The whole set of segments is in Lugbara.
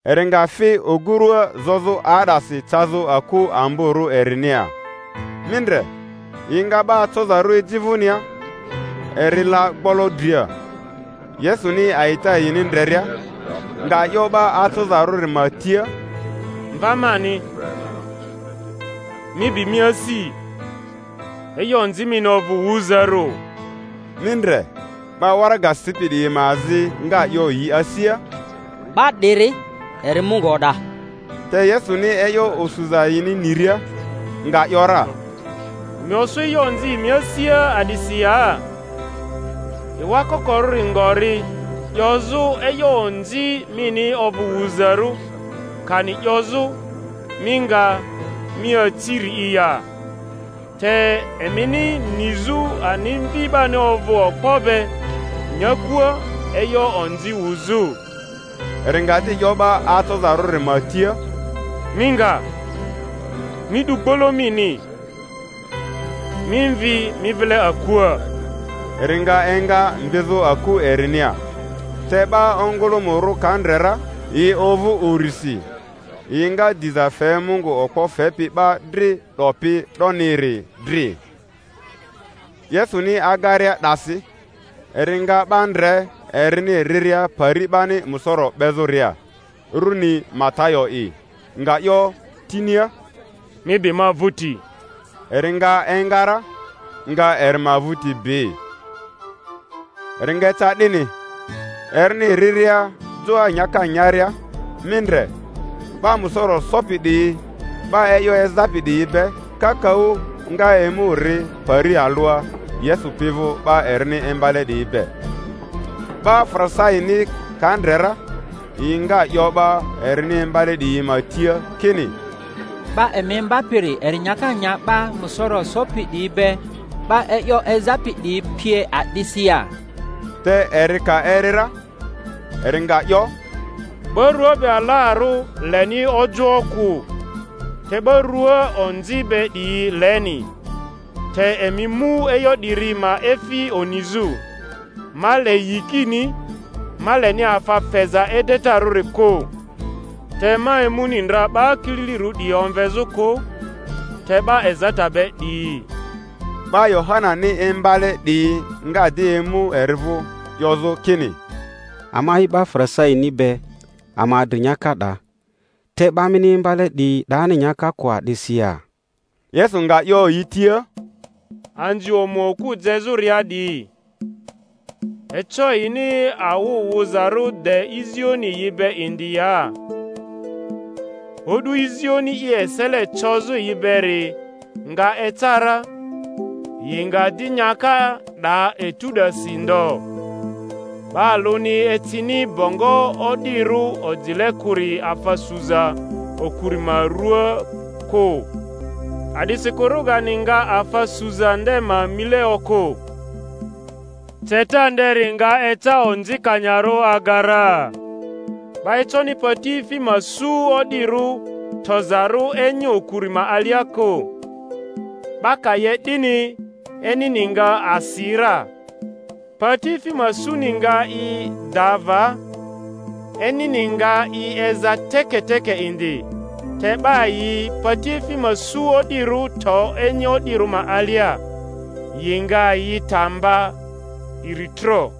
Eri nga fi ogurua zozᴜ 'aa'dasi cazᴜ aku amborᴜ erinia. Mi ndre, yi nga 'ba acozarᴜ eji vᴜnia, eri la gbolo dria; Yesuni a'ita yini ndreria, nga 'yo 'ba acozarᴜri ma tia, Mva mani, mi bi mi asi; e'yo onzi mini ovᴜ wuzarᴜ. Mi ndre, 'ba waraga sipi 'diyi ma azi nga 'yo yi asia, 'Ba 'diri eri Mungu o'da. Te Yesuni e'yo osuza yini niria, nga ‘yora, Emi osu e'yo onzi emi asia a'disi ya? Ewa kokorᴜri ngori, 'yozᴜ, E'yo onzi mini ovᴜ wuzarᴜ, kani 'yozᴜ, Mi nga, mi aci-ri'i ya? Te emini nizᴜ ani Mvi 'bani ovᴜ okpo be nyakua e'yo onzi wuzᴜ —eri nga di 'yo 'ba acozarᴜri ma tia— Mi nga, mi 'du gbolo mini, mi mvi mi vile akua. Eri nga enga mvizᴜ aku erinia. Te 'ba ongᴜlᴜmᴜrᴜ ka ndre ra yi ovᴜ urisi, yi nga diza fe Mungu okpo fepi 'ba dri 'dopi 'doniri dri. Yesuni agaria 'dasi, eri nga 'ba ndre erini riria pari 'bani musoro 'bezᴜria, runi Matayo'i; nga 'yo tinia, Mi bi ma vᴜti. Eri nga enga ra, nga eri ma vᴜri bi. Eri nga eca 'dini, erini riria joa nyaka nyaria, mi ndre, 'ba musoro sopi 'diyi 'ba e'yo ezapi 'diyi be kakaᴜ nga emu ri pari alᴜa Yesu pi vᴜ 'ba erini imbale 'diyi be. 'Ba Farisaini ka ndre ra, yi nga 'yo 'ba erini imbale 'diyi ma tia kini, 'Ba emi imbapiri eri nyaka nya 'ba musoro sopi 'diyi be, 'ba e'yo ezapi 'diyi pie, a'disi ya? Te eri ka eri ra, eri nga 'yo, Ba rᴜa be alarᴜ leni ojoᴜ kᴜ, te 'ba rᴜa onzi be 'diyi leni. Te emi mu e'yo 'diri ma efi onizᴜ, Ma le yikini, ma leni afa feza edetarᴜri kᴜ. Te ma emuni ndra 'ba kililirᴜ 'diyi omvezᴜ kᴜ, te 'ba ezata be 'diyi. 'Ba Yohanani imbale 'diyi nga di emu eri vᴜ, 'yozᴜ kini, Ama'i 'ba Farisaini be, ama adri nyaka 'da, te 'ba mini imbale 'diyi 'dani nyaka kᴜ a'disi ya? Yesu nga 'yo yi tia, Anzi omu okᴜ jezᴜria 'diyi, eco yini awᴜ wᴜzarᴜ de izioni yi be indi ya? O'du izioni i esele cozᴜ yi beri nga eca ra; yi nga di nyaka 'da etu 'dasi ndo. 'Ba alᴜni ecini bongo o'dirᴜ ojile kᴜri afa suza okuri ma rᴜaa kᴜ, a'disikᴜ rogani nga afa suza nde ma mile okᴜ, ceta nderi nga eca onzikanyarᴜ aga ra. 'Ba econi patiefi ma su o'dirᴜ tozarᴜ enyi okuri ma alia kᴜ; 'ba ka 'ye 'dini, enyini nga asi ra, patiefi ma suni nga i da va, enyini nga i eza teketeke indi; te 'ba yi patiefi ma su o'dirᴜ to enyi o'dirᴜ ma alia, yi nga yi ta mba iritro.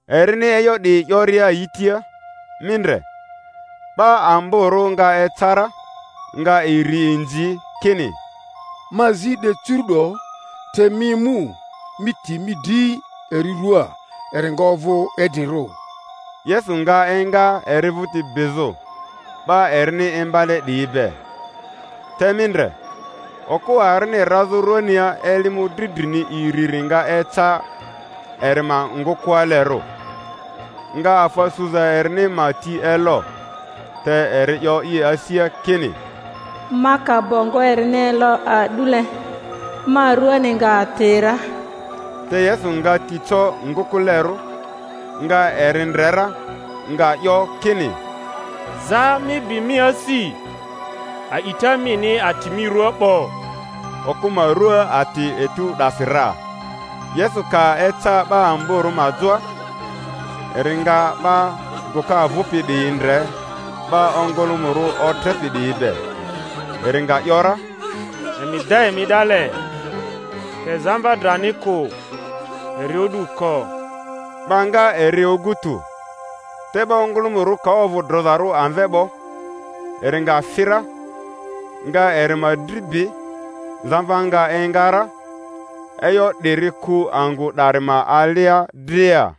Erini e'yo 'diyi 'yoria yi tia, mi ndre, 'ba amborᴜ nga eca ra, nga eri inzi, kini, Ma zi de cucuru'do te mi emu, mi ti mi dri eri ruaa, eri nga ovᴜ idrirᴜ. Yesu nga enga eri vᴜti bizᴜ, 'ba erini imbale 'dryi be. Te mi ndre, okᴜ arini razᴜ rᴜania eli mᴜdri drini iriri nga eca eri ma ngᴜkᴜalerᴜ, nga afa suza erini ma ti elo; te eri 'yo i asia kini, Ma ka bongo erini elo a'dule, ma ruani nga ati ra. Te Yesu nga ti co ngᴜkᴜlerᴜ, nga eri ndre ra, nga 'yo kini, Zaa, mi bi mi asi; a'ita mini ati mi rua 'bo. Okᴜ ma rᴜa ati etu 'dasi ra. Yesu ka eca 'ba amborᴜ ma joa, eri nga 'ba gᴜka vᴜpi 'diyi ndre, 'ba ongᴜlᴜmᴜrᴜ otrepi 'diyi be, eri nga ‘yora, Emi da emi 'dale; te zamva drani kᴜ, eri o'du ko. Ba nga eri ogu tᴜ. Te 'ba ongᴜlᴜmᴜrᴜ ka ovᴜ drozarᴜ amve 'bo, eri nga fi ra, nga eri ma dri bi; zamva nga enga ra. E'yo 'diri ku angᴜ 'dari ma alia dria.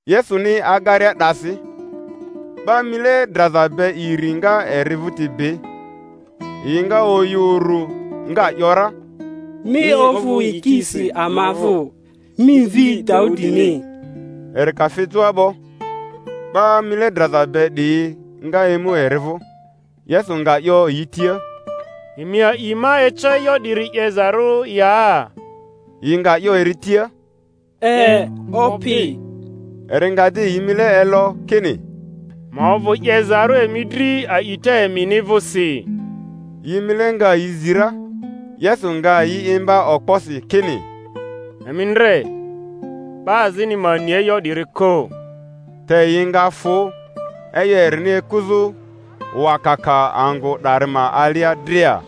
Yesuni agaria 'dasi, 'ba mile draza be iri nga eri vᴜti bi, yi nga oyᴜ uru, nga ‘yora, Mi ovᴜ yikisi ama vᴜ, mi Mvi Daudini. Eri ka fi joa 'bo, 'ba mile draza be 'diyi nga emu eri vᴜ; Yesu nga 'yo yi tia, Emi a'i ma eco e'yo 'diri 'yezarᴜ ya? Yi nga 'yo eri tia, E, Opi. Eri nga di yi mile elo, kini, Ma ovᴜ 'yezarᴜ emi dri a'ita emini vᴜsi. Yi mile nga yi zi ra. Yesu nga yi imba okposi kini, Emi ndre 'ba azini ma ni e'yo 'diri kᴜ. Te yi nga fᴜ, e'yo erini ekuzᴜ wakaka angᴜ 'dari ma alia dria.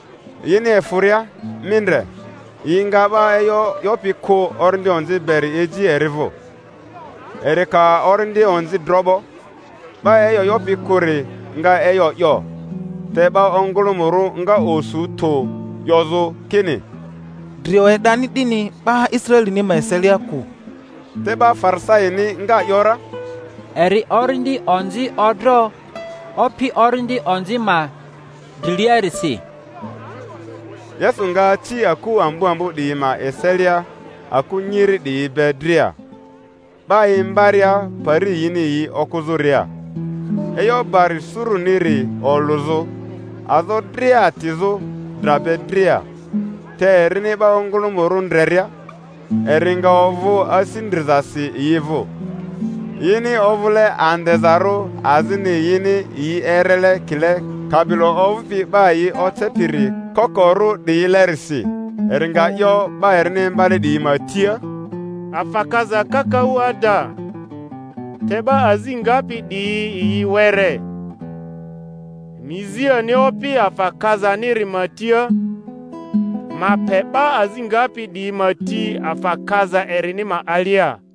Yini efᴜria, mi ndre, yi nga 'ba e'yo 'yopi kᴜ, orindi onzi beri eji eri vᴜ. Eri ka orindi onzi dro 'bo, 'ba e'yo 'yopi kᴜri nga e'yo 'yo; te 'ba ongᴜlᴜmᴜrᴜ nga osu tᴜ, 'yozᴜ kini, Drio e'dani 'dini 'ba Israelini ma eselia kᴜ. Te 'ba Farisaini nga ‘yora, Eri orindi onzi odro opi orindi onzi ma driliarisi. Yesu nga aci aku ambo ambo 'diyi ma eselia aku nyiri 'diyi be dria, 'ba imbaria pari yini yi okᴜzᴜria, e'yo bari suruniri olᴜzᴜ, azo dria atizᴜ, dra be dria. Te erini 'ba ongᴜlᴜmᴜrᴜ ndreria, eri nga ovᴜ asi ndrizasi yi vᴜ, yini ovᴜle andezarᴜ azini yini yi erele ekile kabilo ovᴜpi 'ba yi ocepiri kokorᴜ 'diyilerisi. Eri nga 'yo 'ba erini imbale 'diyi ma tia, Afa kaza kakaᴜ ada, te 'ba azi ngapi 'diyi yi were; emi zi ani Opi afa kazaniri ma tia, ma pe 'ba azi ngapi 'diyi ma ti afa kaza erini ma alia.